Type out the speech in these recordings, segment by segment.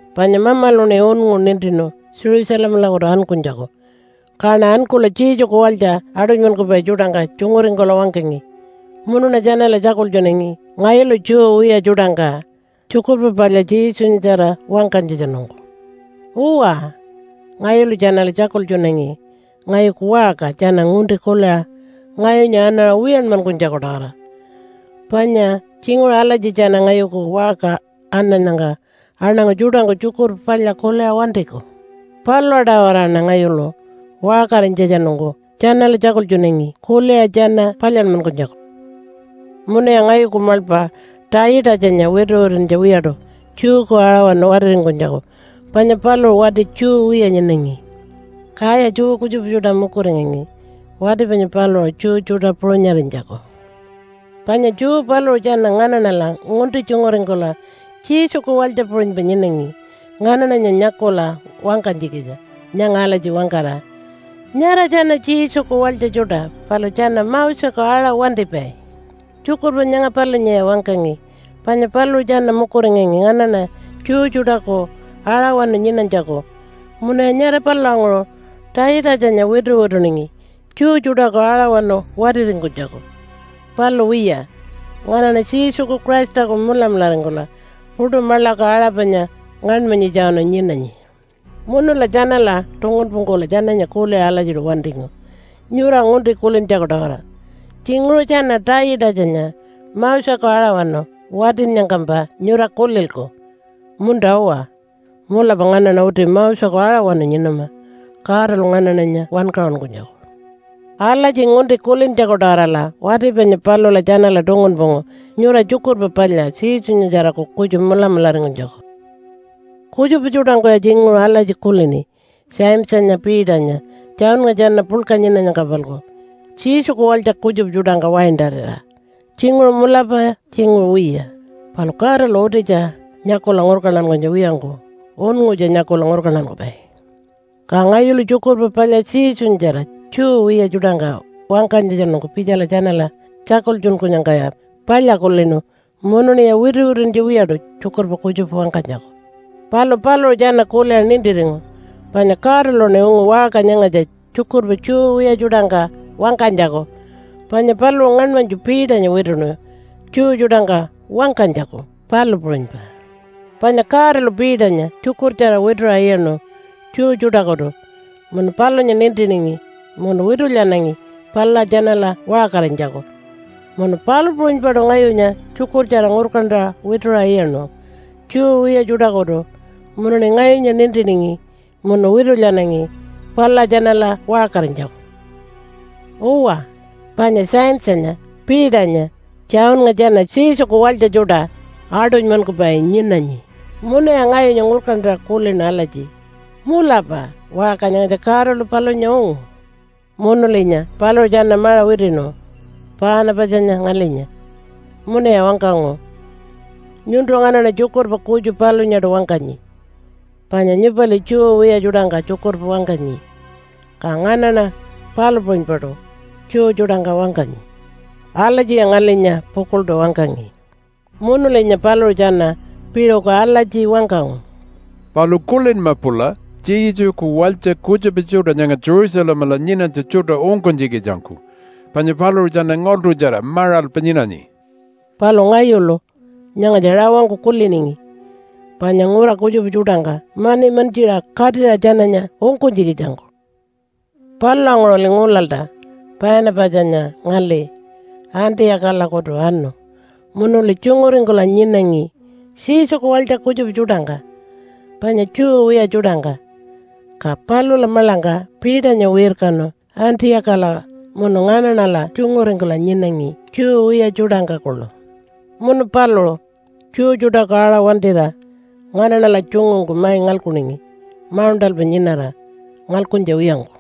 Panya Mamaluṉi unngu nintinu Jerusalemalakutu ankunytjaku, kaṉa ankula Jesuku walytja aṯunymankupai tjuṯangka tjunguringkula wangkangi. Munuṉa tjanala tjakultjunangi ngayulu Jew wiya tjuṯangka Tjukurpa Palya Jesunyatjara wangkanytjatjanungku. Uwa, ngayulu tjanala tjakultjunangi ngayuku waṟka tjana ngunti kuliṟa ngayunya anaṟa wiyanmankunytjaku-tawara. Panya tjinguṟu alatji tjana ngayuku waṟka anannyangka aṉangu tjuṯangku Tjukurpa Palya kuliṟa wantiku. Palula-tawaraṉa ngayulu waṟkarinytjatjanungku tjanala tjakultjunangi kuliṟa tjana palyanmankunytjaku. Munuya ngayuku maḻpa Taitatjanya wituwituntja wiyaṯu Jewku aṟawanu watiringkunytjaku, panya paluṟu wati Jew wiya nyinangi. Kaya Jew kutjupa tjuṯa mukuringangi wati panya paluṟu Jew tjuṯa puṟunyarinytjaku. Panya Jew paluṟu tjana nganaṉala ngunti tjunguringkula Jesuku walytja puṟunypa nyinangi nganaṉanya nyakula wangkanytjikitja nyanga alatji wangkara, “Nyara tjana Jesuku walytja tjuṯa palu tjana Moseku aṟa wantipai.” Tjukurpa nyanga palunyaya wangkangi panya paluṟu tjana mukuringangi nganaṉa Jew tjuṯaku aṟawanu nyinanytjaku munuya nyara palulanguṟu Taitatjanya wituwituningi Jew tjuṯaku aṟawanu watiringkunytjaku. Palu wiya, nganaṉa Jesuku Christaku mulamularingkula puṯu maḻaku aṟa panya ngaṉmanyitjawanu nyinanyi. Munula tjanala tungunpungkula tjananya kuliṟa alatjiṯu wantingu nyura ngunti kulintjaku-tawara. Tjinguṟu tjana Taitatjanya Moseku aṟawanu watinnyangkampa nyura kulilku, “Munta-uwa, mulapa nganaṉa uti Moseku aṟawanu nyinama Godalu nganaṉanya wankaṟunkunytjaku.” Alatji ngunti kulintjaku-tawarala wati panya palula tjanala tungunpungu nyura Tjukurpa Palya Jesunyatjaraku kutju mulamularingkunytjaku. Kutjupa tjuṯangkuya tjinguṟu alatji kulini Jamesanya, Peternya, Johnnga tjana puḻka nyinanyangka-palku Jesuku walytja kutjupa tjuṯangka waintarira. Tjinguṟu mulapa, tjinguṟu wiya, palu Godalu utitja nyakula ngurkantankunytja wiyangku unngutja nyakula ngurkantankupai. Ka ngayulu Tjukurpa Palya Jesunyatjara Jew wiya tjuṯangka wangkanytjatjanungku pitjala tjanala tjakultjunkunyangkaya palya kulinu, munuṉiya wituwituntja wiyaṯu tjukurpa kutjupa wangkanytjaku. Palu paluṟu tjana kuliṟa nintiringu panya Godaluṉi ungu waṟka nyangatja tjukurpa Jew wiya tjuṯangka wangkanytjaku, panya paluṟu ngaṉmanytju Peternya wituṉu Jew tjuṯangka wangkanytjaku, palu puṟunypa. Panya Godalu Peternya tjukurtjara wituṟa iyaṉu Jew tjuṯakutu munu palunya nintiningi munu witulyanangi palula tjanala waṟkarinytjaku. Munu palu puṟunypaṯu ngayunya tjukurtjara ngurkantaṟa wituṟa iyaṉu Jew wiya tjuṯakutu munuṉi ngayunya nintiningi munu witulyanangi palula tjanala waṟkarinytjaku. Uwa, panya Jamesanya, Peternya, Johnnga tjana Jesuku walytja tjuṯa aṯunymankupai nyinanyi. Munuya ngayunya ngurkantaṟa kulinu alatji, “Mulapa waṟka nyangatja Godalu palunya ungu.” Munulinya paluṟu tjana maṟa witiṉu Paanapatjanya ngalinya, munuya wangkangu, “Nyuntu nganaṉa tjukurpa kutju palunyaṯu wangkanyi. Panya nyupali Jew wiya tjuṯangka tjukurpa wangkanyi, ka nganaṉa palu puṟunypaṯu Jew tjuṯangka wangkanyi.” Alatjiya ngalinya pukuḻṯu wangkangi. Munulinya paluṟu tjana piṟuku alatji wangkangu, “Palu kulinma pula Jesuku walytja kutjupa tjuṯa nyanga Jerusalemala nyinanytja tjuṯa ungkunytjikitjangku panya paluṟu tjana ngaḻṯutjara maṟalpa nyinanyi.” Palu ngayulu nyangatja rawangku kuliningi panya ngura kutjupa tjuṯangka mani mantjiṟa katira tjananya ungkunytjikitjangku. Palulanguṟuli ngulalta Paanapatjanya ngali Antiyakalakutu anu munuli tjunguringkula nyinangi Jesuku walytja kutjupa tjuṯangka panya Jew wiya tjuṯangka. Ka palula maḻangka Peternya wirkanu Antiyakala munu nganaṉala tjunguringkula nyinangi Jew wiya tjuṯangka kuḻu. Munu paluṟu Jew tjuṯaku aṟa wantira nganaṉala tjungungku mai ngalkuningi mauṉṯalpa nyinara ngalkuntja wiyangku.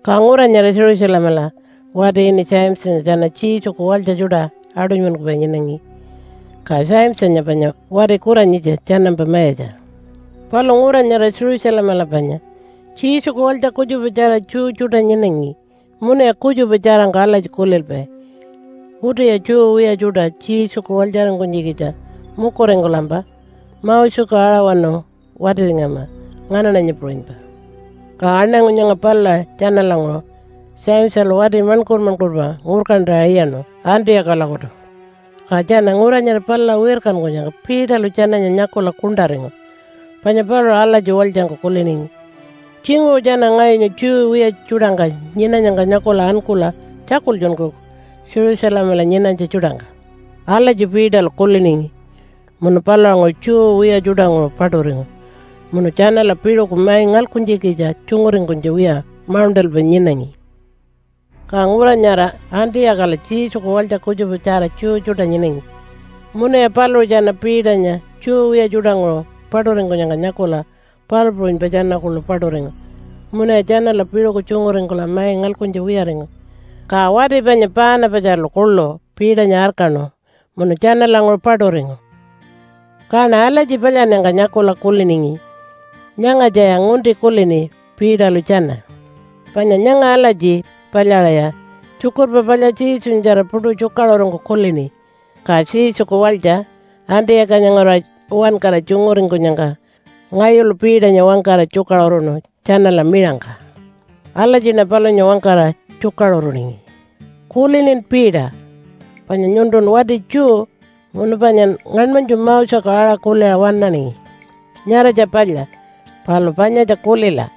Ka ngura nyara Jerusalemala wati ini Jamesanya tjana Jesuku walytja tjuṯa aṯunymankupai nyinangi, ka Jamesanya panya wati kuranyitja tjanampa mayatja. Palu ngura nyara Jerusalemala panya Jesuku walytja kutjupatjara Jew tjuṯa nyinangi, munuya kutjupa tjarangku alatji kulilpai, “Utiya Jew wiya tjuṯa Jesuku walytjaringkunytjikitja mukuringkulampa Moseku aṟawanu watiringama nganaṉanya puṟunypa.” Ka aṉangu nyanga palula tjanalanguṟu Jamesalu wati maṉkur-maṉkurpa ngurkantaṟa iyaṉu Antiyakalakutu. Ka tjana ngura nyara palula wirkankunyangka Peterlu tjananya nyakula kuṉṯaringu, panya paluṟu alatji walytjangku kuliningi, “Tjinguṟu tjana ngayunya Jew wiya tjuṯangka nyinanyangka nyakula ankula tjakultjunkuku Jerusalemala nyinanytja tjuṯangka.” Alatji Peterlu kuliningi munu palulanguṟu Jew wiya tjuṯanguṟu paṯuringu munu tjanala piṟuku mai ngalkuntjikitja tjunguringkunytja wiya mauṉṯalpa nyinangi. Ka ngura nyara Antiyakala Jesuku walytja kutjupatjara Jew tjuṯa nyinangi. Munuya paluṟu tjana Peternya Jew wiya tjuṯanguṟu paṯuringkunyangka nyakula palu puṟunypa tjana kuḻu paṯuringu munuya tjanala piṟuku tjunguringkula mai ngalkuntja wiyaringu. Ka wati panya Paanapatjalu kuḻu Peternya arkaṉu munu tjanalanguṟu paṯuringu. Kaṉa alatji palyannyangka nyakula kuliningi, “Nyangatjaya ngunti kulini Peterlu tjana.” Panya nyanga alatji palyaṟaya Tjukurpa Palya Jesunyatjara puṯu tjukaṟurungku kulini. Ka Jesuku walytja Antiyakanya nguraṟa uwankara tjunguringkunyangka ngayulu Peternya wangkara tjukaṟuruṉu tjanala miṟangka. Alatjiṉa palunya wangkara tjukaṟuruningi, “Kulinin Peter? Panya nyuntun wati Jew, munu panyan ngaṉmanytju Moseku aṟa kuliṟa waṉaningi. Nyaratja palya. Palu panyatja kulila,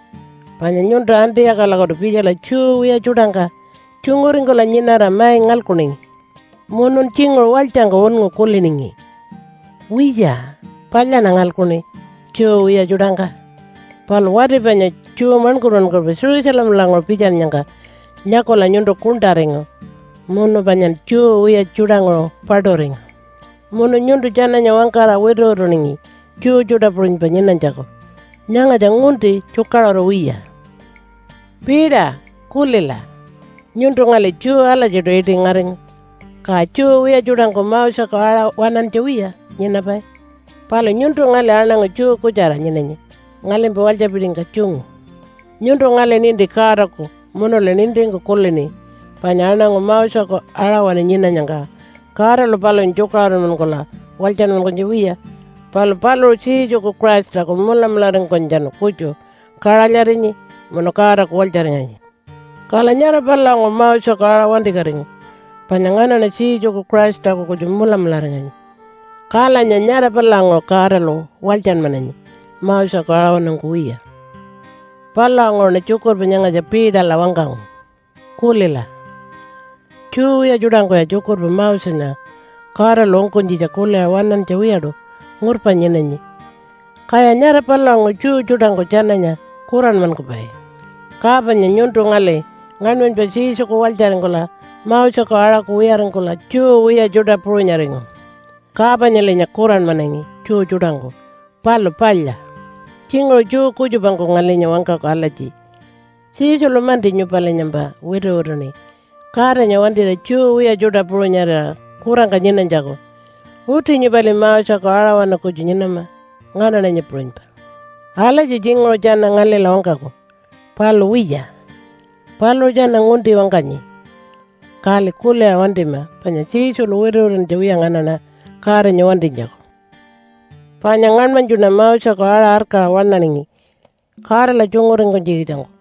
panya nyuntu Antiyakalakutu pitjala Jew wiya tjuṯangka tjunguringkula nyinara mai ngalkuningi. Munun tjinguṟu walytjangku unngu kuliningi, ‘Wiya, palyaṉa ngalkuṉi Jew wiya tjuṯangka.’ Palu wati panya Jew maṉkur-maṉkurpa Jerusalemalanguṟu pitjanyangka nyakula nyuntu kuṉṯaringu munu panyan Jew wiya tjuṯanguṟu paṯuringu. Munu nyuntu tjananya wangkara wituwituningi Jew tjuṯa puṟunypa nyinanytjaku. Nyangatja ngunti tjukaṟuru wiya. “Peter kulila, nyuntu ngali Jew alatjiṯu iṯi ngaringu. Ka Jew wiya tjuṯangku Moseku aṟa waṉantja wiya nyinapai. Palu nyuntu ngali aṉangu Jew kutjara nyinanyi ngalimpa walytjapitingka tjungu. Nyuntu ngali ninti Godaku munuli nintingku kulini panya aṉangu Moseku aṟawanu nyinanyangka Godalu palunya tjukaṟurunmankula walytjanmankunytja wiya. Palu paluṟu Jesuku Christaku mulamularingkunytjatjanu kutju kaṟalyarinyi munu Godaku walytjaringanyi. Kala nyara palulanguṟu Moseku aṟa wantikatingu, panya nganaṉa Jesuku Christaku kutju mulamularinganyi, kalanya nyara palulanguṟu Godalu walytjanmananyi Moseku aṟawanungku wiya.” Palulanguṟuṉa tjukurpa nyangatja Peterla wangkangu, “Kulila, Jew wiya tjuṯangkuya tjukurpa Mosenya Godalu ungkunytjitja kuliṟa waṉantja wiyaṯu ngurpa nyinanyi. Kaya nyara palulanguṟu Jew tjuṯangku tjananya kuranmankupai. Ka panya nyuntu ngali ngaṉmanypa Jesuku walytjaringkula Moseku aṟaku wiyaringkula Jew wiya tjuṯa puṟunyaringu, ka panyalinya kuranmanangi Jew tjuṯangku. Palu palya. Tjinguṟu Jew kutjupangku ngalinya wangkaku alatji, ‘Jesulu-manti nyupalinyampa wituwituṉi Godanya wantira Jew wiya tjuṯa puṟunyarira kurangka nyinanytjaku. Uti nyupali Moseku aṟawanu kutju nyinama nganaṉanya puṟunypa.’ Alatji tjinguṟu tjana ngalila wangkaku. Palu wiya, paluṟu tjana ngunti wangkanyi, kali kuliṟa wantima. Panya Jesulu wituwituntja wiya nganaṉa Godanya wantinytjaku. “Panya ngaṉmanytjuṉa Moseku aṟa arkaṟa waṉaningi Godala tjunguringkunytjikitjangku,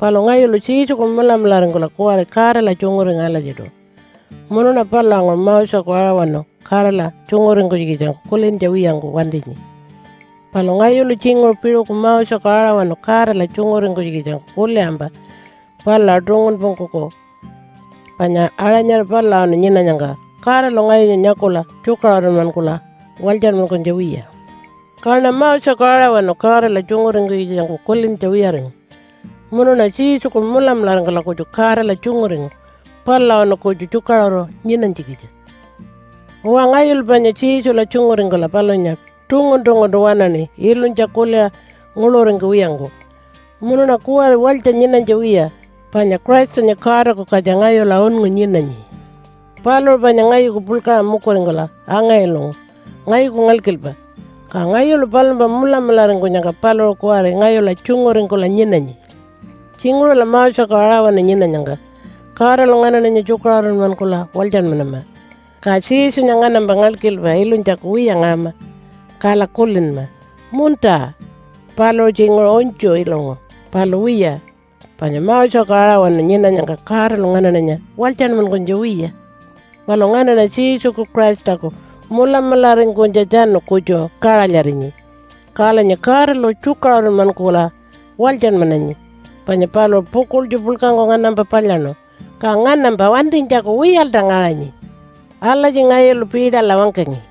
palu ngayulu Jesuku mulamularingkula kuwari Godala tjunguringu alatjiṯu, munuṉa palulanguṟu Moseku aṟawanu Godala tjunguringkunytjikitjangku kulintja wiyangku wantinyi. Palu ngayulu tjinguṟu piṟuku Moseku aṟawanu Godala tjunguringkunytjikitjangku kuliṟampa palula tungunpungkuku, panya aṟa nyara palulawanu nyinanyangka Godalu ngayunya nyakula tjukaṟurunmankula walytjanmankunytja wiya. Kaṉa Moseku aṟawanu Godala tjunguringkunytjikitjangku kulintja wiyaringu, munuṉa Jesuku mulamularingkula kutju Godala tjunguringu palulawanu kutju tjukaṟuru nyinanytjikitja. “Uwa, ngayulu panya Jesula tjunguringkula palunya tungun-tunguntu waṉaṉi ilunytja kuliṟa nguḻuringkuwiyangku. Munuṉa kuwari walytja nyinanytja wiya, panya Christanya Godaku katja ngayula unngu nyinanyi. Paluṟu panya ngayuku puḻkaṟa mukuringkula anga-ilungu ngayuku ngalkilpa. Ka ngayulu palumpa mulamularingkunyangka paluṟu kuwari ngayula tjunguringkula nyinanyi. Tjinguṟula Moseku aṟawanu nyinanyangka Godalu nganaṉanya tjukaṟurunmankula walytjanmanama, ka Jesunya nganampa ngalkilpa ilunytjaku wiya ngaṟama, kala kulinma, ‘Munta, paluṟu tjinguṟu unytju ilungu.’ Palu wiya, panya Moseku aṟawanu nyinanyangka Godalu nganaṉanya walytjanmankunytja wiya. Palu nganaṉa Jesuku Christaku mulamularingkunytjatjanu kutju kaṟalyarinyi kalanya Godalu tjukaṟurunmankula walytjanmananyi, panya paluṟu pukuḻtju puḻkangku nganampa palyaṉu. Ka nganampa wantinytjaku wiyalta ngaṟanyi.” Alatji ngayulu Peterla wangkangi.